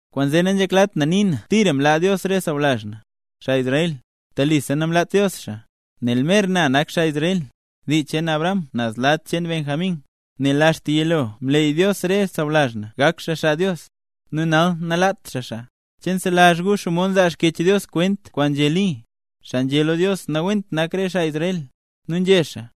Kwaanzee nanzheklat na nii na tira mlaa Dios re sawlazh na, xaa Israel. ¡Telisa namlaat Dios xaa! Nel mer na nak xaa Israel, dii cheen Abraham naz lad cheen Benjamín. Nel axta yilo, mleey Dios re sawlazh na gak xaa xaa Dios; nu nal nalaat xaa xaa. ¿Che nselazh gu xomod nzaa Xkyech Dios kwent kwaan nzhé Li, xaa nzhé lo Dios nawent nak re xaa Israel? Nu nzhé xaa: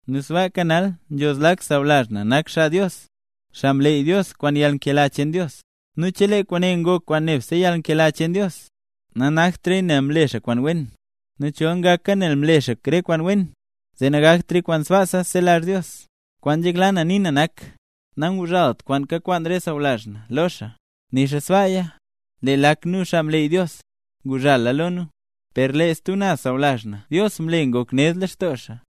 Nu sbaaka nal nzho zlak sawlazh na nak xaa Dios, xaa mleey Dios kwaan yalnkela cheen Dios. Nu chelee kwaane ngoka kwaan nebse yalnkela cheen Dios, nanaktraya nel mle xaa kwaan wen; nu chol ngaka nel mle xaa re kwaan wen, zee nangaktraya kwaan sbaasa nzelazh Dios. Kwaan nzhekla na nii na nak, nanguzhalt kwaan kakwaan xaa sawlazh na lo xaa. Nixa sbaaya lee lak nu, xaa mleey Dios, nguzhala lo nu; per lee re stub naz sawlazh na Dios mle ngok ned lextoo xaa.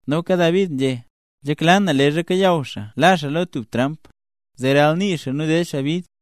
Noka David nzhé: Nzhekla na leezha kayaw xaa la xaa lo tub tramp, zee ralnii xaa nu ded xaa bid.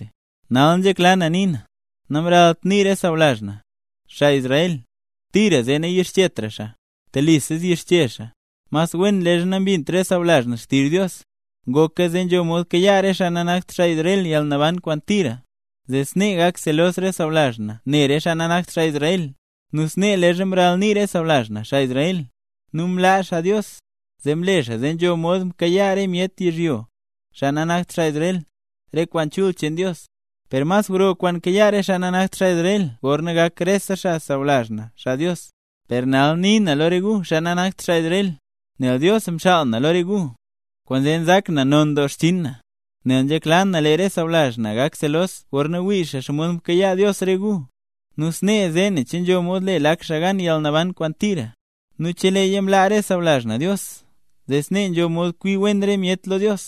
Nal nzhekla na nii na, namralt nii re sawlazh na, xaa Israel tira, zee nayixchetra xaa. ¡Telisa yixche xaa! Mas wen leezha nambint re sawlazh na xtizh Dios, ngoka zee nzho mod kayaa re xaa nanakt Israel yalnaban kwaan tira, zee snee gak selos re sawlazh na ne re xaa nanakt xaa Israel. Nu snee leezha mralnii re sawlazh na, xaa Israel, nu mlaa xaa Dios, zee mle xaa zee nzho mod mkayaa re myet yizhyo, xaa nanakt xaa Israel, re kwaan chul cheen Dios; per mas gro kwaan kayaa re xaa nanakt xaa Israel gorna gak rese xaa sawlazh na xaa Dios. Per nal nii na lo re gu, xaa nanakt xaa Israel, nel Dios mxaal na lo re gu, kwaanzee nzak na non doo xchinn na, nel nzhekla na lee re sawlazh na gak selos gorna wii xaa xomod mkayaa Dios re gu, nu snee zee nen che nzho mod le lak xaa gan yalnaban kwaan tira. Nu cheleeya mlaa re sawlazh na Dios, zee snee nzho mod kwi wen re myet lo Dios,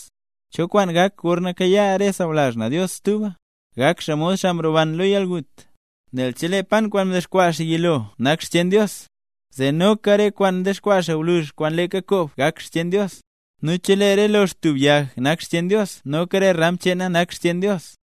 ¿cho kwaan gak gorna kayaa re sawlazh na Dios stuba? ¡Gak xaa mod xaa mroban lo yalgut! Nel chelee pan kwaan mdexkwaa xaa yilo nak xcheen Dios, zee noka re kwaan dexkwaa gwluzh kwaan leeka koob gak xcheen Dios. Nu chelee re lox tub yag naka xcheen Dios noka re ram cheena nak xcheen Dios.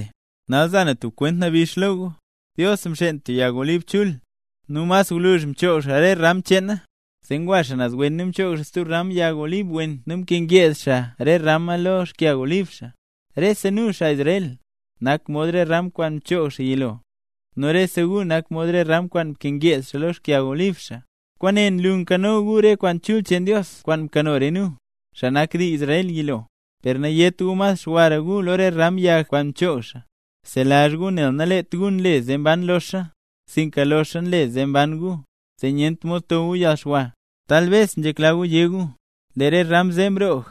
Nal za na tub kwent nabix lo gu. Dios mxeen tub yag olib chul, nu mas gwluzh mchoog xaa re ram cheena. Zee ngwa xaa naz wen nu mchoog xaa ram stub yag olib wen nu mkangeed xaa re ram ne lo xkyag olib xaa. Rese nu, xaa Israel, nak mod ram kwaan mchoog xaa yilo, nu rese gu nak mod re ram kwaan nkangeed xaa lo xkyag olib xaa. Kwaane nlu nkano gu re kwaan chul cheen Dios kwaan mkano re nu, xaa nak dii Israel, yilo. Per nayét gu mas xwara gu lo re ram yag kwaan mchoog xaa. Bzelazh gu nel naleet gu nle zee mban loxa, sinka loxa nle zee mban gu, zee nyent mod to gu yalxwa. Talbes nzhekla gu yé gu: “Lee re ram zee mroog,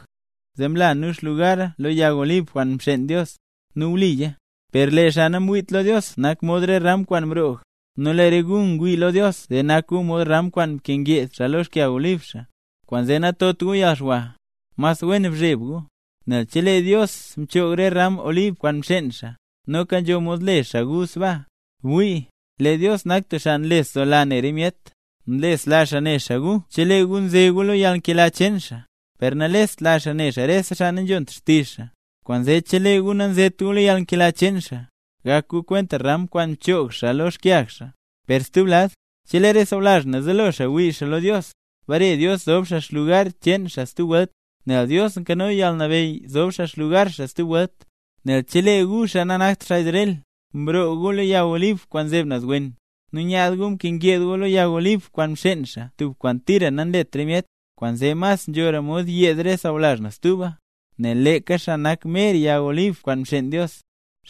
zee mla nu xlugara lo yag olib kwaan mxeen Dios”. Nu wliya. Per lee xaa namwiit lo Dios nak mod re ram kwaan mroog, nu lee re gu ngwii lo Dios zee nak gu mod ram kwaan nkangeed xaa lox xkyag olib xaa. Kwaanzee natot gu yalxwa, mas wen bzheb gu. Nel chelee Dios mchoog re ram olib kwaan mxeen xaa, noka nzho mod le xaa gu sbaa. Bwii, lee Dios nak tub xaa nlesdoola ne re myet. Nlesla xaa ne xaa gu chelee gu nze gu lo yalnkela cheen xaa, per nalestla xaa ne xaa rese xaa nanzhont xtizh xaa. Kwaanzee chelee gu nazet gu lo yalnkela cheen xaa, gak gu kwent ram kwaan mchoog xaa lo xkyag xaa. Per stub lad, chelee re sawlazh na zelo xaa wii xaa lo Dios, bare Dios zob xaa lugar cheen xaa stub welt, nel Dios nkano yalnabeyy zob xaa xlugar xaa stub welt. Nel chelee gu, xaa nanakt xaa Israel, mroog gu lo yag olib kwaan nzeb naz wen, nu nyaad gu ngyeed gu lo yag olib kwaan mxeen xaa (tub kwaan tira nanlet re myet), kwaanzee mas nzhora mod yeed re sawlazh na stuba, nel leeka xaa nak mer yag olib kwaan mxeen Dios.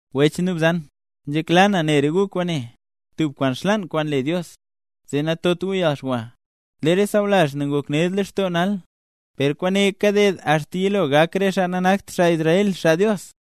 Wech nu bzan, nzhekla na ne re gu kwaane, tub kwaan xlaan kwaan le Dios, zee natot gu yalxwa. Lee re sawlazh na ngok ned lextoo nal, per kwaane kaded axta yilo gak re xaa nanakt xaa Israel, xaa Dios.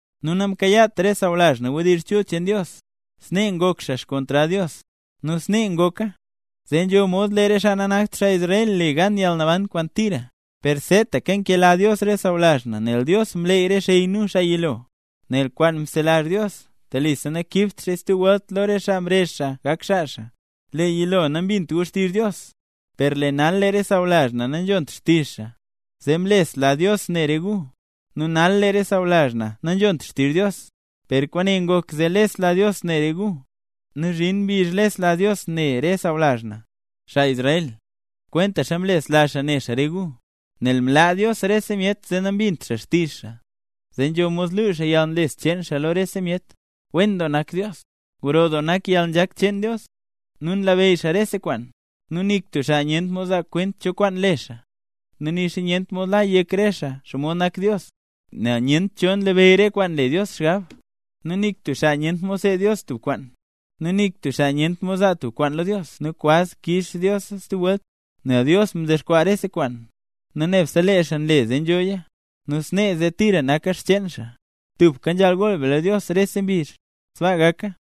Nu namkayaat re sawlazh na wdizh chul cheen Dios, snee ngok xaa xkontrad Dios. Nu snee ngoka, zee nzho mod lee re xaa nanakt Israel le gan yalnaban kwaan tira. Per seetaka nkela Dios re sawlazh na nel Dios mleey re xey nu, xaa yilo. Nel kwaan nzelazh Dios, telisa nakiibt xaaya stub welt lo re xaa mrezh xaa gak xaa xaa. Lee yilo, nambint gu xtizh Dios, per lee nal re sawlazh na nanzhont xtizh xaa, zee mlesla Dios ne re gu. Nu nal lee re sawlazh na nanzhont xtizh Dios, per kwaane ngok zee lesla Dios ne re gu; nu zhin mbizh lesla Dios ne Dios re sawlazh na, xaa Israel, kwentaxa mlesla xaa ne xaa re gu. Nel mlaa Dios rese myet zee nambint xaa xtizh xaa, zee nzho mod luu xaa yalnlesla cheen xaa lo rese myet. ¡Wen doo nak Dios! ¡Gro doo nak re yalnzhak cheen Dios, nu nlabeyy xaa rese kwaan! Nu nik tub xaa nyent mod zaa kwent cho kwaan le xaa, nu nixa nyent mod la yek re xaa xomod nak Dios. Nel nyent cho nlabeyy re kwaan nle Dios xgab, nu nik tub xaa nyent mod seed Dios tub kwaan. Nik tub xaa nyent mod zaa tub kwaan lo Dios nu kwaz kix Diosa stub welt. Nel Dios mdexkwaa rese kwaan, nu nebse lee xaa nle zee nzhoya, nu snee zee tira naka xcheen xaa. ¡Tubka nzhaal gool be lo Dios rese mbizh! ¡Sbaa gaka!